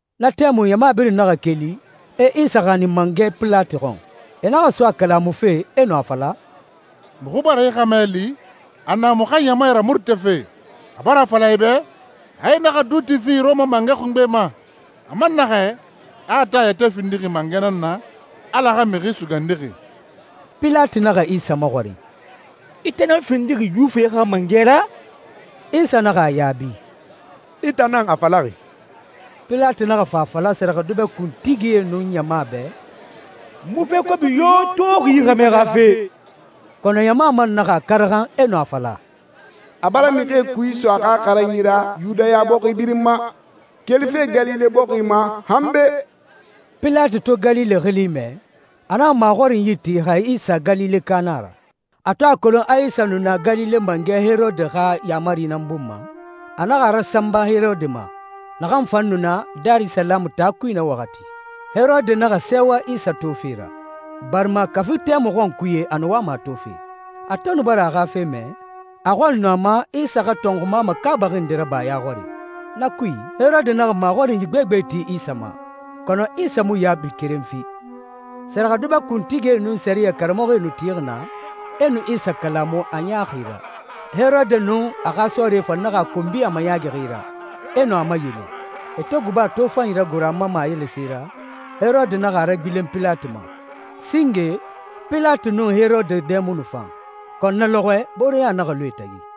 Na tɛmui ɲama birin naxa keli, e Isa xanin mangɛ Pilati xɔn. E naxa so a kalamufe, e nu a fala, «Muxu bara yi xɛmɛ li a na muxu xa ɲama ramurutafe. A bara a fala e bɛ a e naxa duuti fi Rɔma mangɛ xungbe ma. A man naxɛ, a a tan yɛtɛ findixi mangɛ nan na, Ala xa Mixi Sugandixi.» Pilati naxa Isa maxɔrin, «I tan nan findixi Yuwifie xa mangɛ ra?» Isa naxa a yaabi, «I tan nan a falaxi.» Pilati naxa fa a fala sɛrɛxɛdubɛ kuntigie nun ɲama bɛ, «N mu fe kobi yo toxi yi xɛmɛ xa fe.» Kɔnɔ ɲama man naxa a karaxan, e nu a fala, «A bara mixie kui iso a xa xaranyi ra Yudaya bɔxi birin ma, kelife Galile bɔxi ma, han be.» Pilati to Galile xili mɛ, a naxa maxɔrinyi ti xa Isa Galileka nan a ra. A to a kolon a Isa nu na Galile mangɛ Herode xa yaamari nan bun ma, a naxa a rasanba Herode ma, naxan fan nu na Darisalamu taa kui na waxati. Herode naxa sɛɛwa Isa tofe ra, barima kafi tɛmui xɔnkuye a nu wama a tofe. A to nu bara a xa fe mɛ, a xɔli nu a ma Isa xa tɔnxuma makaabaxi nde raba a ya xɔri. Na kui, Herode naxa maxɔrinyi gbegbe ti Isa ma, kɔnɔ Isa mu yaabi keren fi. Sɛrɛxɛdubɛ kuntigie nun sɛriyɛ karamɔxɔe nu tixi naa, e nu Isa kalamu a ɲaaxi ra. Herode nun a xa sɔɔrie fan naxa a konbi a mayaagixi ra, e nu a mayele. E to guba tofanyi ragoro a ma mayele se ra, Herode naxa a ragbilen Pilati ma. Singe, Pilati nun Herode dɛ mu nu fan, kɔnɔ na lɔxɔɛ booreɲa naxa lu e tagi.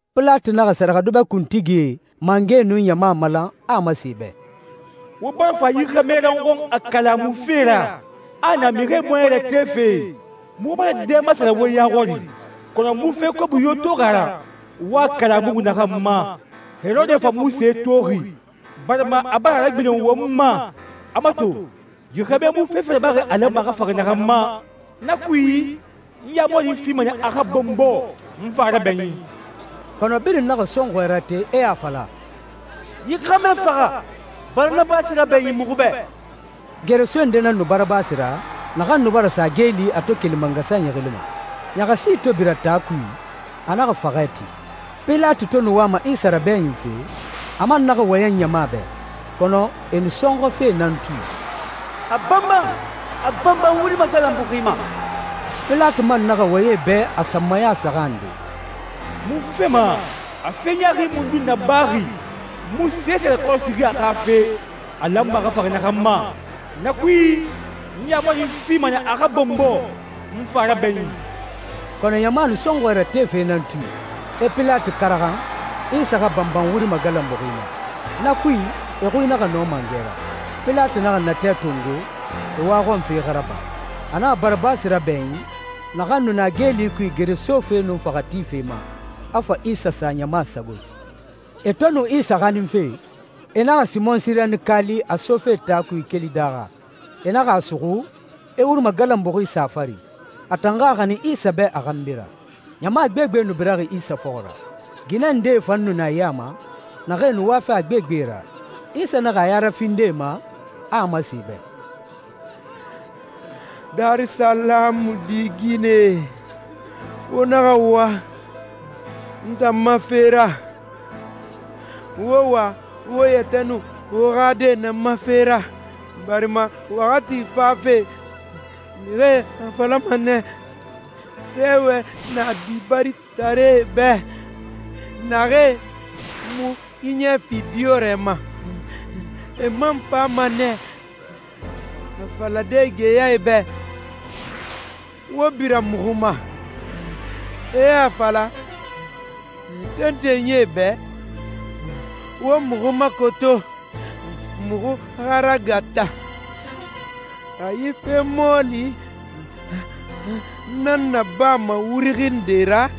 Pilati naxa sɛrɛxɛdubɛ kuntigie, mangɛe, nun ɲama malan, a a masen e bɛ, «Wo bara fa yi xɛmɛ ra n xɔn a kalamufe ra a a na mixie bɔɲɛ ratefe. Muxu bara dɛ masara wo ya xɔri, kɔnɔ n mu fe kobi yo toxi a ra, wo a kalamuxi naxan ma. Herode fan mu se toxi, barima a bara a ragbilen won ma. A mato, yi xɛmɛ mu fefe rabaxi a lanma a xa faxa naxan ma. Na kui, n yaamari fima nɛ a xa bɔnbɔ, n fa a rabɛɲin.» Kɔnɔ birin naxa sɔnxɔɛ rate, e a fala, «Yi xɛmɛ faxa! Barabasi rabɛɲin muxu bɛ.» Geresoe nde nan nu Barabasi ra naxan nu bara sa geeli a to keli mangasanyi xili ma. Ɲaxasi to bira taa kui, a naxa faxɛ ti. Pilati to nu wama Isa rabɛɲinfe, a man naxa wɔyɛn ɲama bɛ, kɔnɔ e nu sɔnxɔfe nan tui, «A banban! A banban wuri magalanbuxi ma!» Pilati man naxa wɔyɛn e bɛ a sanmaya saxan nde, «Munfe ma? A fe ɲaaxi mundun nabaxi? N mu sese rakɔrɔsixi a xa fe, a lanma a xa faxa naxan ma. Na kui, n yaamari fima nɛ a xa bɔnbɔ, n fa a rabɛɲin.» Kɔnɔ ɲama nu sɔnxɔɛ ratefe nan tui, e Pilati karaxan, Isa xa banban wuri magalanbuxi ma. Na kui, e xui naxa nɔ mangɛ ra. Pilati naxa natɛ tongo, e waxɔnfe xa raba. A naxa Barabasi rabɛɲin, naxan nu na geeli kui gere sofe nun faxɛ tife ma, a fa Isa sa ɲama sagoe. E to nu Isa xaninfe, e naxa Simɔn Sirenika li, a sofe taa kui keli daaxa. E naxa a suxu, e wuri magalanbuxi sa a fari, a tan xa a xanin Isa bɛ a xanbi ra. Ɲama gbegbe nu biraxi Isa fɔxɔ ra. Ginɛ ndee fan nu na e ya ma, naxee nu wafe a gbegbe ra. Isa naxa a ya rafindi e ma, a a masen e bɛ, «Darisalamu di ginɛe, wo naxa wa n tan ma fe ra. Wo wa wo yɛtɛ nun wo xa die nan ma fe ra, barima waxati fafe, mixie a falama nɛ, ‹Sɛɛwɛ na dibaritaree bɛ, naxee mu xiɲɛ fi diyɔrɛ ma.›» «E man fama nɛ a falade geyae bɛ, ‹Wo bira muxu ma!› E a fala tentenyie bɛ, ‹Wo muxu makoto, muxu xa ragata!›» «Xa yi fe mɔɔli nan nabama wuri xinde ra,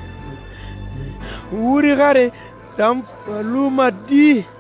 wuri xare tan fa luma di?»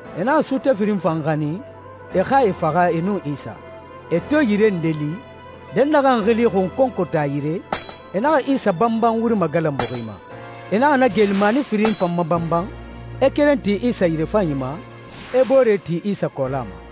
E naxa suute firin fan xanin, e xa e faxa e nun Isa. E to yire nde li, dɛnnaxɛ xili xunkonkota yire, e naxa Isa banban wuri magalanbuxi ma. E naxa na geelimani firin fan mabanban, e keren ti Isa yirefanyi ma, e boore ti Isa kɔɔla ma.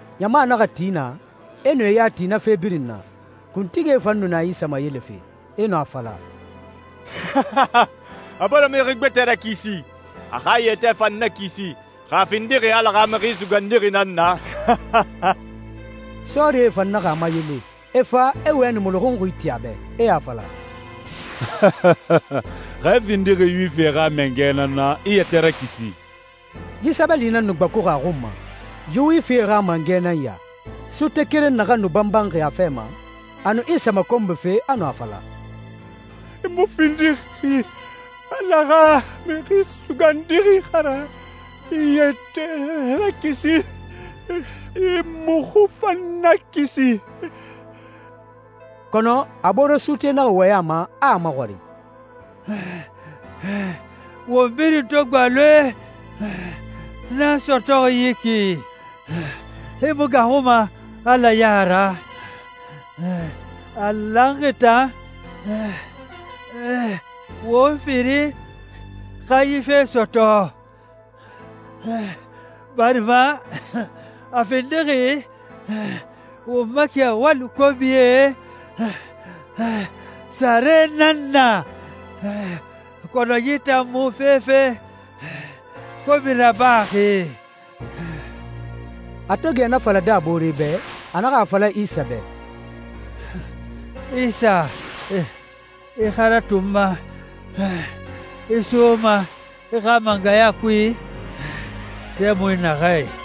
Ɲama naxa ti naa, e nu e ya ti na fe birin na. Kuntigie fan nu na Isa mayelefe, e nu a fala, «A bara mixi gbɛtɛe rakisi. A xa a yɛtɛ fan nakisi, xa a findixi Ala xa Mixi Sugandixi nan na!» Sɔɔrie fan naxa a mayele, e fa, e wɛni muluxunxi ti a bɛ, e a fala, «Xa i findixi Yuwifie xa mangɛ nan na, i yɛtɛ rakisi!» Yi sɛbɛli nan nu gbakuxi a xun ma, «Yuwifie xa mangɛ nan ya.» Suute keren naxan nu banbanxi a fɛ ma, a nu Isa makonbife, a nu a fala, «I mu findixi Ala xa Mixi Sugandixi xa ra? I yɛtɛ rakisi, i muxu fan nakisi!» Kɔnɔ a boore suute naxa wɔyɛn a ma, a a maxɔrin, «Won birin to gbaloe nan sɔtɔxi yi ki, i mu gaaxuma Ala ya ra? A lanxi tan won firin xa yi fe sɔtɔ, barima a findixi won ma kɛwali kobie sare nan na. Kɔnɔ yi tan mu fefe kobi rabaxi.» A to gɛ na falade a boore bɛ, a naxa a fala Isa bɛ, «Isa, i xa ratu n ma i soma i xa mangɛya kui tɛmui naxɛ.»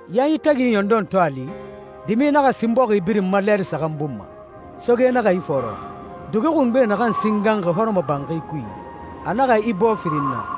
Yanyi tagi ɲɔndɔn to a li, dimi naxa sin bɔxi birin ma, lɛɛri saxan bun ma. Soge naxa ifɔɔrɔ. Dugi xungbe naxan singanxi hɔrɔmɔbanxi kui, a naxa ibɔɔ firin na.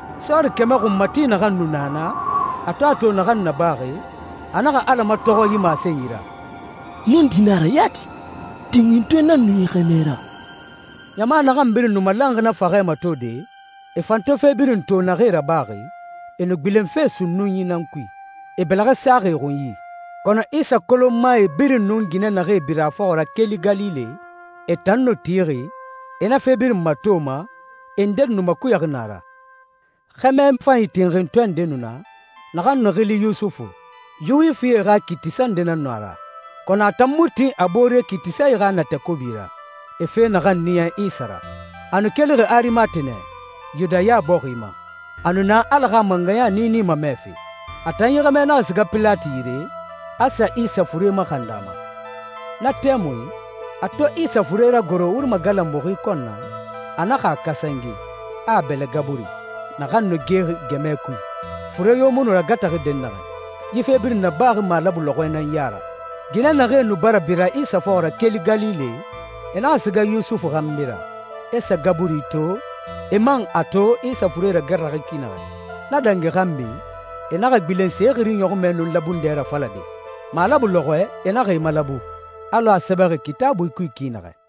Sɔɔri kɛmɛ xunmati naxan nu na naa, a to a to naxan nabaxi, a naxa Ala matɔxɔ yi masenyi ra, «Nɔndi na a ra yati, tinxintɔɛ nan nu yi xɛmɛ ra!» Ɲama naxan birin nu malanxi na faxɛ matode, e fan to fe birin to naxee rabaxi, e nu gbilenfe sunnunyi nan kui, e bɛlɛxɛ saxi e xunyi. Kɔnɔ Isa kolonmae birin nun ginɛ naxee bira a fɔxɔ ra keli Galile, e tan nu tixi, e na fe birin matoma, e ndedi nu makuyaxi naa ra. Xɛmɛ fanyi tinxintɔɛ nde nu na, naxan nu xili Yusufu. Yuwifie xa kiitisa nde nan nu a ra, kɔnɔ a tan mu tin a boore kiitisae xa natɛ kobi ra, e fe naxan niya Isa ra. A nu kelixi Arimate nɛ, Yudaya bɔxi ma. A nu na Ala xa mangɛya niini mamɛfe. A tan yi xɛmɛ naxa siga Pilati yire, a sa Isa fure maxandi a ma. Na tɛmui, a to Isa fure ragoro wuri magalanbuxi kɔn na, a naxa a kasange, a a bɛlɛ gaburi, naxan nu gexi gɛmɛ kui, fure yo mu nu ragata dɛnnaxɛ. Yi fe birin nabaxi malabu lɔxɔɛ nan ya ra. Ginɛ naxee nu bara bira Isa fɔxɔ ra keli Galile, e naxa siga Yusufu xanbi ra, e sa gaburi to, e man a to Isa fure ragata ki naxɛ. Na dangi xanbi, e naxa gbilen se xiri ɲɔxunmɛ nun labundɛ rafalade. Malabu lɔxɔɛ e naxa e malabu, alɔ a sɛbɛxi Kitaabui kui ki naxɛ.